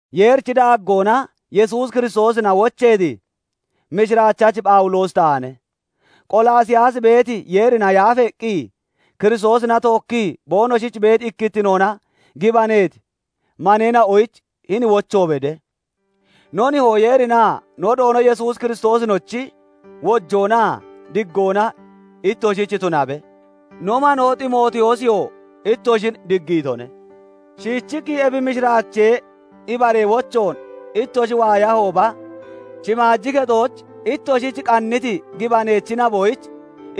Yeerichi daaggoona Yesuus Kiristoosina wocheeti mishiraachachi Phawuloosi taane; Qolaasiyaas beeti Yeerina yaafeeqqi Kiristoosina tookkii boonoshich beeti ikkittinoona gibaneeti maneena'oyich hini wocho bede; No nihoo Yeerinaa no Doono Yesuus Kiristoosinochi wojoonaa diggoona ittoshich tunabe. No manoo Ximootiyoosiyoo ittoshin diggiitone. Shiichiqqi ebi mishiraachee ibaree wochoon ittoshi waayahooba, shimaaji kexooch ittoshich qanniti gibaneechi naboyich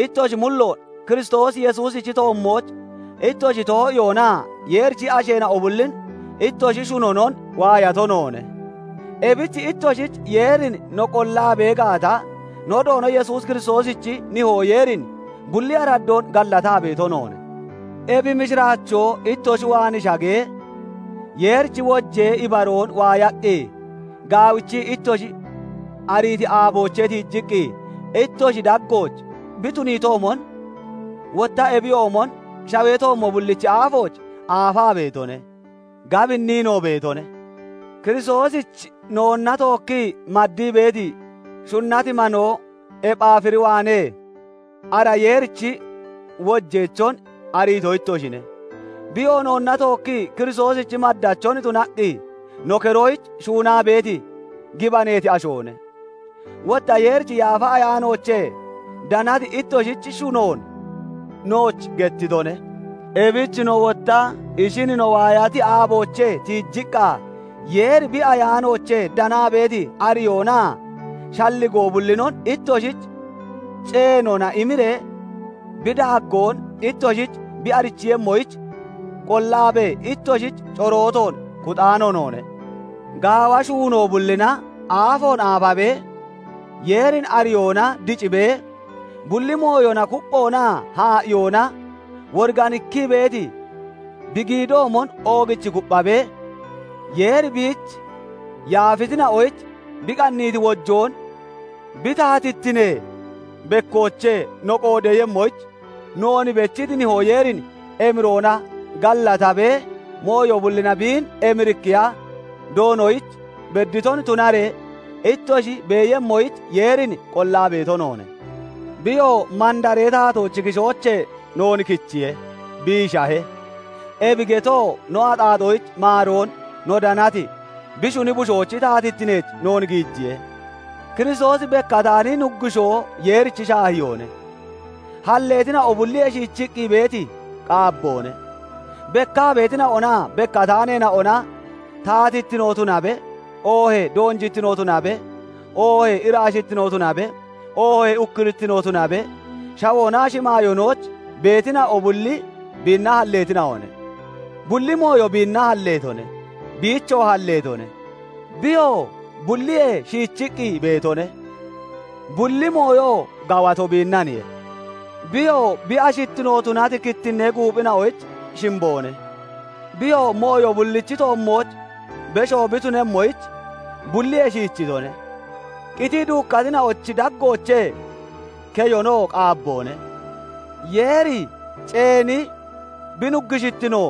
ittoshi mulloon Kiristoos Yesuusichi toommooch ittoshi too'iyoonaa Yeerichi asheena'o bullin ittoshi shunonon waayato noone; ebich ittoshich Yeerin no qollaa bee gaata, no Doono Yesuus Kiristoosichi Nihoo Yeerin bulli araddoon gallataa beeto noone. Ebi mishiraachoo ittoshi waan shagee, Yeerichi wojee ibaroon waayaqqi gaawichii ittoshi ariiti aaboochee tiijiqqi ittoshi daggooch bi tuniitoomon, wotta ebiyoomon shawee toommo bulliich aafoon aafaa beetone; gabinniinoo beetone. Kiristoosich noonna tookkii maddii beeti, shunnati manoo Ephaafir waanee ara Yeerichi wojeechon ariito ittoshine; biyoo noonna tookkii Kiristoosichi maddachon tunaqqi no keroyich shuunaa beeti gibaneeti ashoone. Wotta Yeerichi Yaafa Ayaanoochee danati ittoshichi shunoon nooch gettitone. Ebich no wotta ishin no waayati aaboochee tiijiqqa, Yeeri bi Ayaanoochee danaa beeti ariyoonaa shalligoo bullinon ittoshich ceenoona imiree bi daaggoon ittoshich bi arichiiyemmoyich, qollaabee ittoshich corootoon kuxaano noone. Gaawa shuunoo bullina aafoon aafabee, Yeerin ariyoona dicibee, bulli mooyona kupphoonaa haa'iyoona woriganikkii beeti bi giidoomon oogichi kupphabee, Yeeri biich yaafeetina'oyich bi qanniiti wojoon bi taatittinee bekkoochee no qoodeeyemmoyich noon bechiti Nihoo Yeerin emiroona gallatabee, mooyo bullina biin emirikkiya Doonoyich bedditon tunaree ittoshi beeyemmoyich Yeerin qollaa beeto noone. Biyoo mandaree taatoochi kishoochee noon kichiye; biishahe; ebi getoo no axaaxoyich maaroon no danati bi shuni Bushoochi taatittineech noon giijiye. Kiristoosi bekkataani Nuggushoo Yeerichi shaahiyoone; halleetina'o bulliyee shiichiqqi beeti qaabboone; bekkaa beetina'onaa bekkataaneena'ona, taatittino tunabe, oohee doonjittino tunabe, oohee iraashittino tunabe, oohee ukkurittino tunabe, shawoonaa shimaayoonooch beetina'o bulli biinna halleetina'one. Bulli mooyo biinna halleetone; biichoo halleetone. Biyoo bulliyee shiichiqqi beetone; bulli mooyoo gawato biinnaniye. Biyoo bi ashittino tunati kittinnee guuphina'ochi shimboone. Biyoo mooyo bullichi toommooch besho bi tunemmoyich, bulliyee shiichoone; qitii duukkatina'ochi daggoochee keyonoo qaabboone. Yeeri ceeni bi Nuggushittino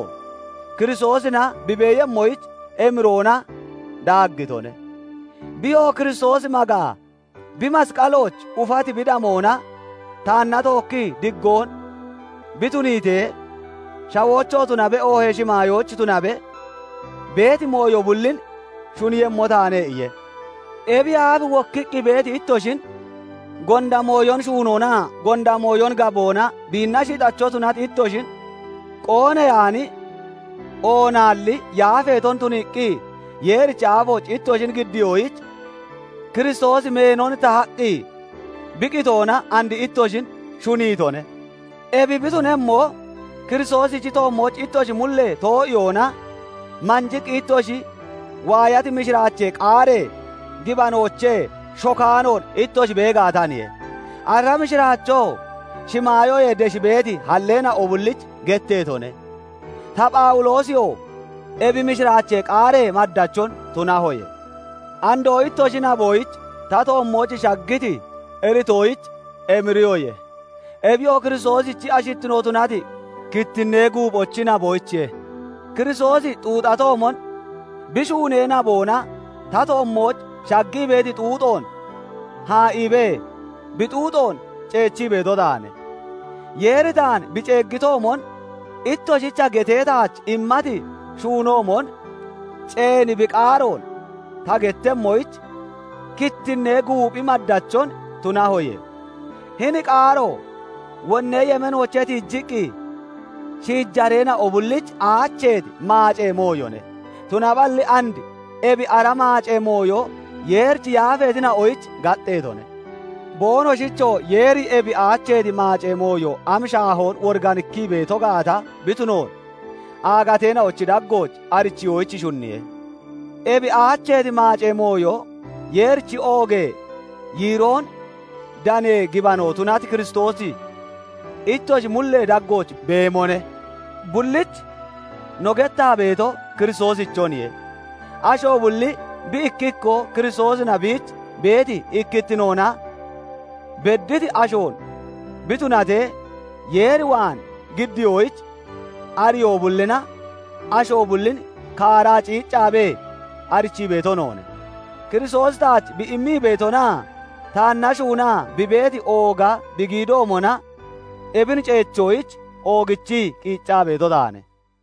Kiristoosina bi beeyemmoyich emiroona daaggitone; biyoo "Kiristoos magaa, bi masqalooch ufati bi damoona taanna tookki diggoon bi tuniitee, shawooch tunabe oohee shimaayooch tunabe beeti mooyo bullin shuniiyemmo taane" iye. Ebiyee aaf wokkiqqi beeti ittoshin, gonda mooyon shuunoonaa gonda mooyon gaboona biinna shixacho tunati ittoshin, qooneyaani oonaalli yaafeeton tuniiqqi Yeerichi aafooch ittoshin giddiyoyich, Kiristoosi meenon tahaqqi bi qitoona and ittoshin shuniitone. Ebi bi tunemmo, Kiristoosichi toommooch ittoshi mullee too'iyoona manjiqqi ittoshi waayati mishiraachee qaaree gibanoochee shokaanoon ittoshi bee gaataniye. Ara mishiraachoo shimaayoyee desh beeti halleetina'o bullich getteetone; ta Phawuloosiyoo ebi mishiraachee qaaree maddachon tunahoye. Andoo ittoshi naboyich ta toommooch shaggiti iritoyich emiriyoye; ebiyoo Kiristoosichi ashittino tunati kittinnee guuphochi naboyichiye; Kiristoosi xuuxatoomon bi shuunee naboona ta toommooch shaggii beeti xuuxoon haa'iibee bi xuuxoon ceechii beeto taane. Yeeri taan bi ceeggitoomon ittoshicha getee taach immati shuunoomon, ceeni bi qaaroon ta gettemmoyich kittinnee guuphi maddachon tunahoye. Hini qaaro wonnee yemeenoochee tiijiqqi shiijareena'o bullich aacheeti maacee mooyone; tunaballi and ebi ara maacee mooyo Yeerich yaafeetina'oyich gaxxeetone. Boonoshichoo Yeeri ebi aacheeti maacee mooyo am shaahoon woriganikkii beeto gaata bi tunoon aagateena'ochi daggooch arichiyoyich shunniye; ebi aacheeti maacee mooyo Yeerichi oogee yiiroon danee gibano tunati Kiristoosi ittoshi mullee daggooch beemone. Bullich no gettaa beeto Kiristoosichoniye. Asho bulli bi ikki ikkoo Kiristoosina biich beeti ikkittinoona bedditi ashoon bi tunatee Yeer waan giddiyoyich ariyoo bullina asho bullin kaaraa ciiccaabee arichii beeto noone. Kiristoosi taach bi immii beetonaa taanna shuunaa bi beeti ooga bi giidoomona ebin ceechoyich oogichii qiiccaa beeto taane.